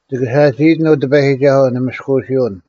ᒋᑭ ᓴᒋᐃᑎᓐ, ᐅ ᑎᐸᔨᒋᒐᓱᐤ, ᓂ ᒥᔅᑯᐅᓯᐅᓐ᙮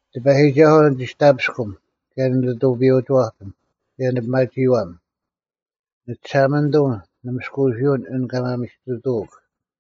ᑎᐸᔨᒋᒐᓱᐤ ᓂᒋᔅᑕᐱᔅᑯᒻ, ᑭᔭ ᓂᓂᑐᐱᔪᐅᒋᐛᐱᒻ, ᑭᔭ ᓂᐱᒪᒋᐃᐛᒻ; ᓂᒋᓴᒪᓂᑐᒻ, ᓂ ᒥᔅᑯᐅᓯᐅᓐ ᐊᓐ ᑲ ᒪᒥᓯᑐᑐᐅᒃ;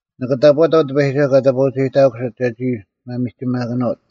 ᓂᑭ ᑕᑈᑕᐤ ᑎᐸᔨᒋᒐᓱᐤ ᑲ ᑕᑈᐅᒐᔨᑕᑯᓯᑦ ᒐᒋ ᒪᒥᒋᒪᑭᓄᐅᑦ: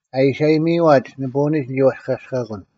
ᐊ ᐃᓯ ᐊᔨᒥᐃᐛᒡ ᓂᐳᐅᓂᒡ ᓂᒋ ᐛᔅᑲᔅᑲᑯᓐ,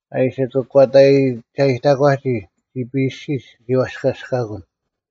ᐊ ᐃᓯ ᑯᒂᑕᒐᔨᑕᒂᒋ ᒋᐱ ᐊᔅᒋᒡ ᓂᒋ ᐛᔅᑲᔅᑲᑯᓐ: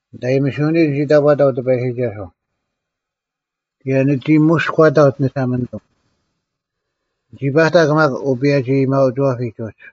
ᓂᑦ ᐊᔨᒥᓯᐅᓂᒡ ᓂᒋ ᑕᑈᑕᐤ ᑎᐸᔨᒋᒐᓱᐤ, ᑭᔭ ᓂᒋ ᒧᔎᑕᐤ ᓂᒋᓴᒪᓂᑐᒻ: ᓂᒋ ᐸᑕᒄ ᒪᒃ ᐅᐸᔭᒋ-ᐊᔭᒥᐊᐅᒋᐛᐱᒡ ᐅᒡ,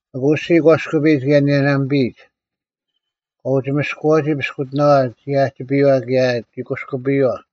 ᐊᑯ ᐊᔅᒋᔾ ᒂᔅᑯᐱᔨᒡ ᑭᔭ ᓂᔭᓇᒥᐱᔨᒡ; ᑲ ᐅᒋ ᒥᔅᑯᐛᒋ ᐱᔅᑯᑎᓇᐛ ᒋ ᐊᔭᒋᐱᔪᐛ ᑭᔭ ᒋ ᑯᔅᑯᐱᔪᐛ,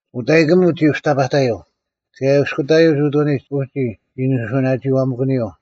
ᐅᑕᔨᑯᒥᒡ ᒋ ᐅᑕᐸᑕᔪᐤ, ᑭᔭ ᐃᔅᑯᑕᔪᐤ ᐅᑐᓂᒡ ᐅᒋ ᒋ ᓂᓱᐅᓇᒋᐃᐛᒪᑭᓂᔪᐤ: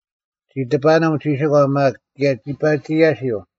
ᒋ ᑕᐸᑎᓂᒻ ᒋᓯᒂ ᒪᒃ, ᑭᔭ ᒋ ᐸᒋ ᔭᓯᐤ: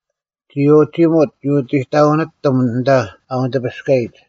ᒋ ᐅᒋᒧᑦ ᐅᑎᑕᐅᓂᑎᒻ ᐊᓐᑕ ᐊ ᐅᓂᑎᐱᔅᑲᔨᒡ,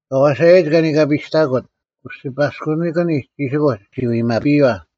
ᐊ ᐛᓴᔭᔨᒡ ᑲ ᓂᑲᓂᐸᔨᔅᑕᑯᑦ ᐅᒋᔅᐸᑲᔅᑯᓂᒡ ᒋᓯᑯᒡ ᒋ ᐎᒪᐱᔪᐛ,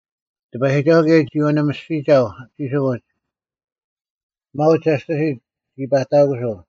ᑎᐸᔨᒋᒐᓱᐤ ᑭᔭ ᒋ ᐅᓂᒥᔅᒋᒐᐤ ᒋᓯᑯᒡ, ᒪᐅᒡ ᒋᔅᑎᓯᑦ ᒋ ᐸᑕᑯᓱᐤ;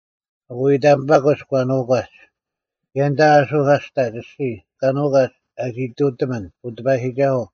ᐊᑯ ᐃᑕᒥᐸᑯᒡ ᑲ ᓄᒂᒡ, ᑭᔭ ᐊᓐᑕ ᐊᓱᐧᑲᔅᑕᒡ ᐊᔅᒋᔾ ᑲ ᓄᒂᒡ ᐊ ᒋᑐᑎᒥᓐ, ᐅ ᑎᐸᔨᒋᒐᓱᐤ,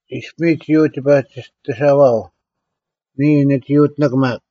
ᐃᔅᐱᒥᒡ ᒋ ᐅᒋ ᐸᒋᑎᓴᐅᐛᐤ, ᓂᔾ ᓂᒋ ᐅᑎᓂᒄ ᒪᒃ,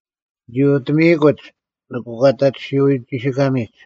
ᓂᒋ ᐅᑎᒥᐃᑯᒡ ᓂ ᑯᒂᑕᒋᓱᐎ ᒋᓯᑲᒥᒡ,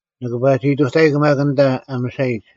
ᓂᑭ ᐸᒋ ᐃᑐᑕᐃᒃ ᑭᔭ ᐊᓐᑕ ᐊ ᒥᓴᔨᒡ: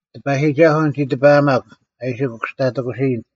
ᑎᐸᔨᒋᒐᓱᐤ ᓂᒋ ᑎᐸᐊᒪᒃ ᐊ ᐃᓯ ᑯᐃᔅᑯᑕᑎᓯᔭᓐ;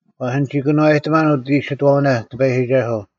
ᐛᔅ ᓂᒋ ᑭᓄᐛᔨᑎᒺᓐ ᐅᑦ ᐃᓯᑥᐅᓇ ᑎᐸᔨᒋᒐᓱᐤ,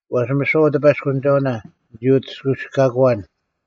ᐛᔅ ᒥᓯᐛ ᐅᑎᐸᔅᑯᓂᒐᐅᓇ ᓂᒋ ᐅᑎᔅᑲᐎᔅᑲᑯᐛᓐ,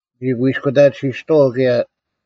ᓂᒋ ᑯᐃᔅᑯᑕᑎᓯᔅᑐᐛᐤ ᑭᔭ,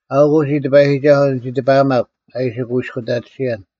ᐊᐅᒄ ᐅᒋ ᑎᐸᔨᒋᒐᓱᐤ ᓂᒋ ᑎᐸᐊᒪᒃ ᐊ ᐃᓯ ᑯᐃᔅᑯᑕᑎᓯᔭᓐ,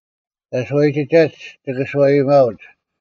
ᑲ ᓱᐛᔨᒋᒐᒡ ᒋᑭ ᓱᐛᔨᒪᐅᒡ;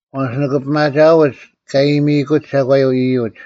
ᐛᔅ ᒋᑭ ᐱᒪᒋᐊᐅᒡ ᑲ ᐊᔨᒥᑯᒡ ᒐᒂᔪᐤ ᐃᔪᒡ;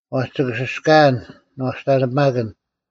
ᐛᔅ ᒋᑭ ᓯᔅᑲᐊᓐ ᓂᐛᔅᑕᓂᐱᒪᑭᓐ: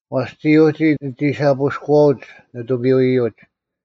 ᐛᔅ ᒋᔾ ᐅᒋ ᓂᒋ ᓴᐳᔅᑯᐛᐅᒡ ᓂᑐᐱᔪᐅ-ᐃᔪᒡ;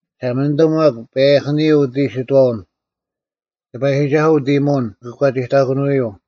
ᒋᓴᒪᓂᑐᐤ ᒪᒃ, ᐸᔭᐧᑭᓂᔪᐤ ᐅᑦ ᐃᓯᑥᐅᓐ; ᑎᐸᔨᒋᒐᓱᐤ ᐅᑦ ᐃᔨᒧᐅᓐ ᑯᒂᒋᑕᑭᓄᐎᔪᐤ: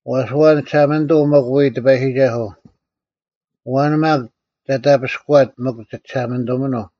ᐛᔅ ᐊᐛᓐ ᒋᓴᒪᓂᑐᐤ ᒥᒄ ᐎᔾ ᑎᐸᔨᒋᒐᓱᐤ? ᐊᐛᓐ ᒪᒃ ᒐᔅᑕᐱᔅᑯᐎᑦ ᒥᒄ ᒋ ᒋᓴᒪᓂᑐᒥᓄᐤ?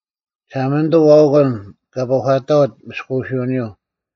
ᒋᓴᒪᓂᑐᐤ ᐊᐅᑯᓐ ᑲ ᐱᒂᑕᐅᑦ ᒥᔅᑯᐅᓯᐅᓂᔪᐤ,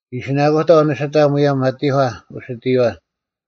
ᐃᓯᓇᑯᑕᐤ ᓂᓯᑕ ᒧᔭᒻ ᐊᑎᒂ ᐅᓯᑎᔨᐛ,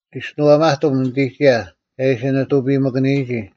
ᒋᔅᒋᓄᐊᒪᑎᒻ ᓂᑎᒋᔭ ᒐ ᐃᓯ ᓂᑐᐱᔨᒥᑭᓂᔨᒋ,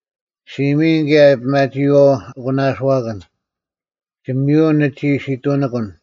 ᔅᒋ ᒥᔨᓐ ᑭᔭ ᐱᒪᒋᐃᐛᐤ ᐊᒂᓇᐅᓱᐛᑭᓐ: ᒋᒥᔪᐅᓐ ᓂᒋ ᓯᑐᓂᑯᓐ,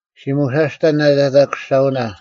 ᔅᒋ ᒧᓴᔅᑕᓐ ᓂᑕᑕᑯᔅᒐᐅᓇ,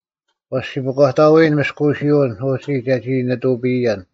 ᐛᔅ ᔅᒋ ᐱᒂᑕᐎᓐ ᒥᔅᑯᐅᓯᐅᓐ ᐅᒋ ᒐᒋ ᓂᑐᐱᔨᔭᓐ: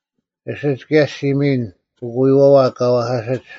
ᐊᓯᒡ ᑭᔭ ᔅᒋ ᒥᔨᓐ ᐅᑯᔪᐛᐛ ᑲ ᐛᐧᑲᓯᒡ;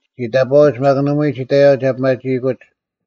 ᒋ ᑕᑈᐅᒡ, ᒪᒃ ᓇᒪᐎᔾ ᒋ ᑕᔪᐛ ᒐ ᐱᒪᒋᐃᑯᒡ,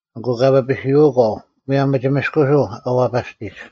ᐊᑯ ᑲ ᐱᐱᓯᐅᒂᐤ ᒧᔭᒻ ᒥᒋᒥᔅᑯᓱᐤ ᐊ ᐛᐸᔅᑎᒡ: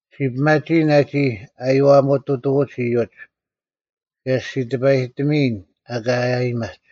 ᔅᒋ ᐱᒪᒋᐃᓐ ᐊᒋ ᐃᔨᐛᒧᑐᑐᐎᒡ ᐃᔪᒡ; ᑭᔭ ᔅᒋ ᑎᐸᔨᑎᒥᐃᓐ ᐊᑲ ᐊᔭᒥᐊᒡ: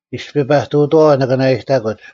ᐃᔅᐱ ᐸᑐᑥᐛ, ᓂᑭ ᓂᓇᐃᑕᑯᒡ,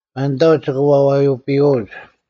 ᒪᓐᑕᐅᒡ ᒋᑭ ᐛᐱᐱᔪᐅᒡ,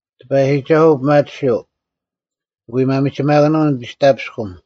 ᑎᐸᔨᒋᒐᓱᐤ ᐱᒪᑎᓯᐤ; ᒋᑭ ᐎ ᒪᒥᒋᒪᑭᓄᐤ ᓂᒋᔅᑕᐱᔅᑯᒻ;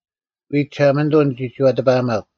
ᐎᔾ ᒋᓴᒪᓂᑐᐤ ᓂᒋ ᒋᐛᑎᐸᐊᒪᒄ,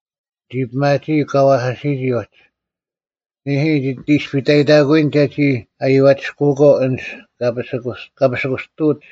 ᓂ ᐱᒪᒋᐃᒄ ᑲ ᐛᐧᑲᓯᔨᒋ ᐅᒡ: ᓂᐦᐃ, ᒋᑦ ᐃᔅᐸᐃᑕᑯᐎᓐ ᒐᒋ ᐊᔪᐛᒋᔅᑯᐛᒂᐤ ᐊᓐᒡ ᑲ ᐱᓯᑯᔅᑐᐅᒡ;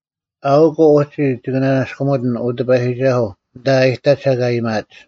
ᐊᐅᒄ ᐅᒋ ᒋᑭ ᓂᓇᔅᑯᒥᑎᓐ, ᐅ ᑎᐸᔨᒋᒐᓱᐤ, ᐊᓐᑕ ᐊ ᐃᑕᒡ ᐊᑲ ᐊᔭᒥᐊᒡ,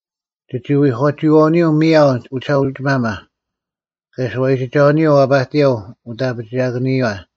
ᒋᒋ ᐎᒂᒋᐃᐛᐅᓂᔪᐤ ᒥᔭᐤ ᐅᒋᓴᐅᒋᒪᒪ, ᑭᔭ ᓱᐛᔨᒋᒐᐅᓂᔪᐤ ᐛᐸᑎᔭᐤ ᐅᑦ ᐊᐱᒋᐊᑭᓂᔪᐛ,